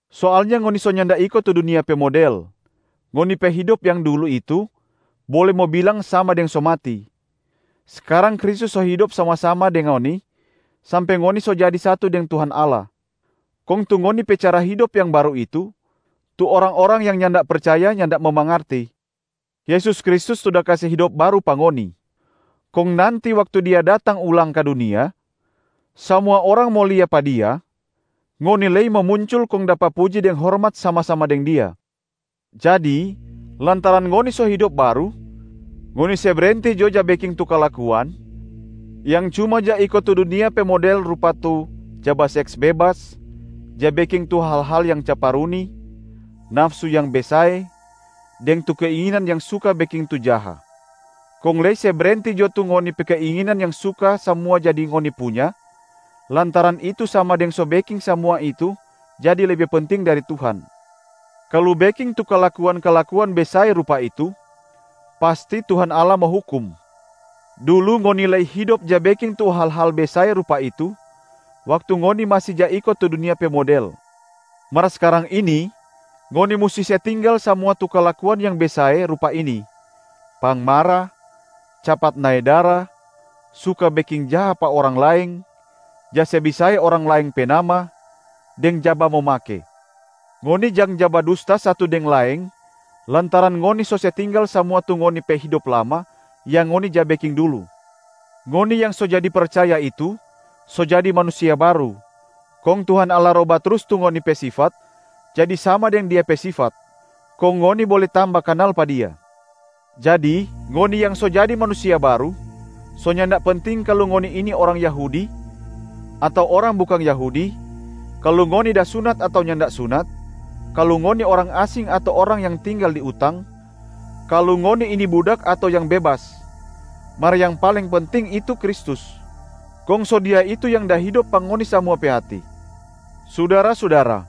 Soalnya ngoni so nyanda iko tu dunia pe model, ngoni pe hidop yang dulu itu bole mo bilang sama deng so mati. Skarang Kristus so hidop sama-sama deng ngoni sampe ngoni so jadi satu deng Tuhan Allah. Kong tu ngoni pe cara hidop yang baru itu, tu orang-orang yang nyanda percaya nyanda mo mangarti. Yesus Kristus tu da kase hidop baru pa ngoni. Kong nanti waktu Dia datang ulang ka dunia, samua orang mo lia pa Dia, ngoni lei mo muncul kong dapa puji deng hormat sama-sama deng Dia. Jadi lantaran ngoni so hidop baru, ngoni se brenti jo ja beking tu kalakuan yang cuma ja iko tu dunia pe model rupa tu: ja baseks bebas, ja beking tu hal-hal yang caparuni, nafsu yang besae, deng tu keinginan yang suka beking tu jaha. Kong lei se brenti jo tu ngoni pe keinginan yang suka samua jadi ngoni punya lantaran itu sama deng so beking samua itu jadi lebe penting dari Tuhan. Kalu beking tu kalakuan-kalakuan besae rupa itu, pasti Tuhan Allah mo hukum. Dulu ngoni lei hidop ja beking tu hal-hal besae rupa itu waktu ngoni masi ja iko tu dunia pe model. Mar skarang ini ngoni musti se tinggal samua tu kalakuan yang besae rupa ini: pangmara, capat nae dara, suka beking jaha pa orang laeng, ja se besae orang laeng pe nama, deng ja bamomake. Ngoni jang ja badusta satu deng laeng lantaran ngoni so se tinggal samua tu ngoni pe hidop lama yang ngoni ja beking dulu. Ngoni yang so jadi percaya itu so jadi manusia baru, kong Tuhan Allah roba trus tu ngoni pe sifat jadi sama deng Dia pe sifat, kong ngoni bole tamba kanal pa Dia. Jadi ngoni yang so jadi manusia baru, so nyanda penting kalu ngoni ini orang Yahudi ato orang bukang Yahudi, kalu ngoni da sunat ato nyanda da sunat, kalu ngoni orang asing ato orang yang tinggal di utang, kalu ngoni ini budak ato yang bebas. Mar yang paling penting itu Kristus, kong so Dia itu yang da hidop pa ngoni samua pe hati. Sudara-sudara,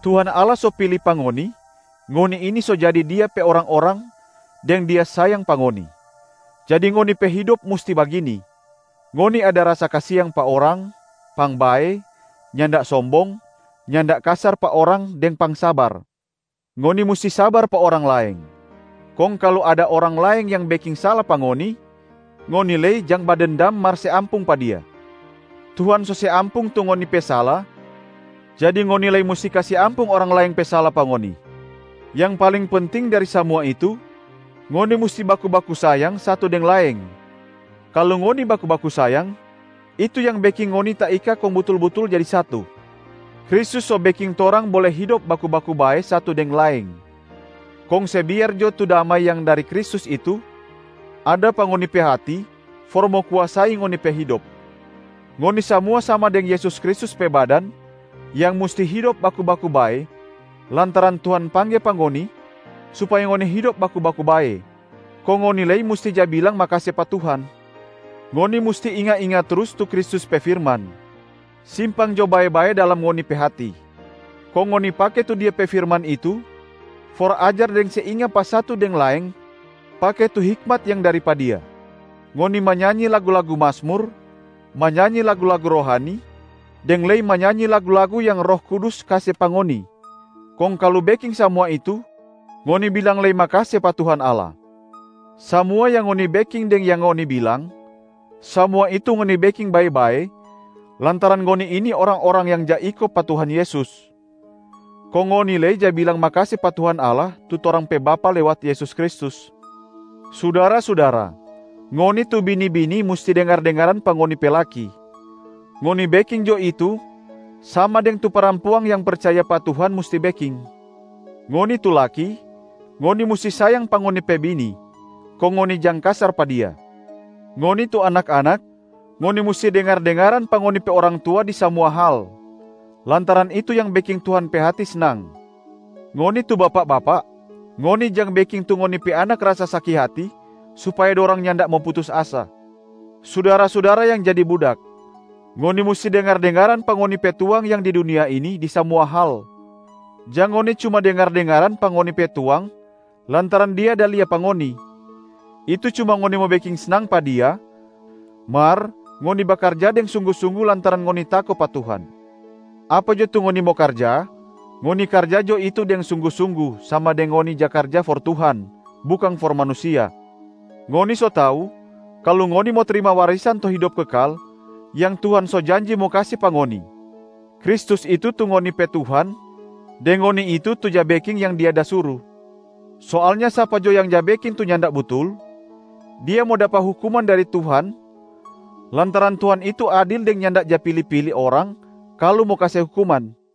Tuhan Allah so pili pa ngoni, ngoni ini so jadi Dia pe orang-orang deng Dia sayang pa ngoni. Jadi ngoni pe hidop musti bagini: ngoni ada rasa kasiang pa orang, pangbae, nyanda sombong, nyanda kasar pa orang deng pangsabar. Ngoni musti sabar pa orang laeng, kong kalu ada orang laeng yang beking sala pa ngoni, ngoni lei jang ja badendam mar se ampung pa dia. Tuhan so se ampung tu ngoni pe sala jadi ngoni lei musti kase ampung orang laeng pe sala pa ngoni. Yang paling penting dari samua itu, ngoni musti baku-baku sayang satu deng laeng. Kalu ngoni baku-baku sayang, itu yang beking ngoni taika kong butul-butul jadi satu. Kristus so beking torang bole hidop baku-baku bae satu deng laeng, kong se biar jo tu damai yang dari Kristus itu ada pa ngoni pe hati for mo kuasai ngoni pe hidop. Ngoni samua sama deng Yesus Kristus pe badan yang musti hidop baku-baku bae lantaran Tuhan pangge pa ngoni supaya ngoni hidop baku-baku bae. Kong ngoni lei musti ja bilang makase pa Tuhan. Ngoni musti inga-inga trus tu Kristus pe firman, simpang jo bae-bae dalam ngoni pe hati. Kong ngoni pake tu Dia pe firman itu for ajar deng se inga pa satu deng laeng pake tu hikmat yang dari pa Dia. Ngoni manyanyi lagu-lagu Mazmur, manyanyi lagu-lagu rohani, deng lei manyanyi lagu-lagu yang Roh Kudus kase pa ngoni, kong kalu beking samua itu ngoni bilang lei makase pa Tuhan Allah. Samua yang ngoni beking deng yang ngoni bilang, samua itu ngoni beking bae-bae lantaran ngoni ini orang-orang yang ja iko pa Tuhan Yesus, kong ngoni lei ja bilang makase pa Tuhan Allah tu torang pe Bapa lewat Yesus Kristus. Sudara-sudara, ngoni tu bini-bini musti dengar-dengaran pa ngoni pe laki, ngoni beking jo itu sama deng tu parampuang yang percaya pa Tuhan musti beking. Ngoni tu laki, ngoni musti sayang pa ngoni pe bini, kong ngoni jang kasar pa dia. Ngoni tu anak-anak, ngoni musti dengar-dengaran pa ngoni pe orang tua di samua hal lantaran itu yang beking Tuhan pe hati snang. Ngoni tu bapak-bapak, ngoni jang beking tu ngoni pe anak rasa saki hati supaya dorang nyanda mo putus asa. Sudara-sudara yang jadi budak, ngoni musti dengar-dengaran pa ngoni pe tuang yang di dunia ini di samua hal. Jang ngoni cuma dengar-dengaran pa ngoni pe tuang lantaran dia da lia pa ngoni, itu cuma ngoni mo beking snang pa dia, mar ngoni bakarja deng sunggu-sunggu lantaran ngoni tako pa Tuhan. Apa jo tu ngoni mo karja, ngoni karja jo itu deng sunggu-sunggu sama deng ngoni ja karja for Tuhan, bukang for manusia. Ngoni so tau kalu ngoni mo trima warisan tu hidop kekal yang Tuhan so janji mo kase pa ngoni. Kristus itu tu ngoni pe Tuhan deng ngoni itu tu ja beking yang Dia da suru. Soalnya sapa jo yang ja beking tu nyanda butul, dia mo dapa hukuman dari Tuhan lantaran Tuhan itu adil deng nyanda ja pili-pili orang kalu mo kase hukuman.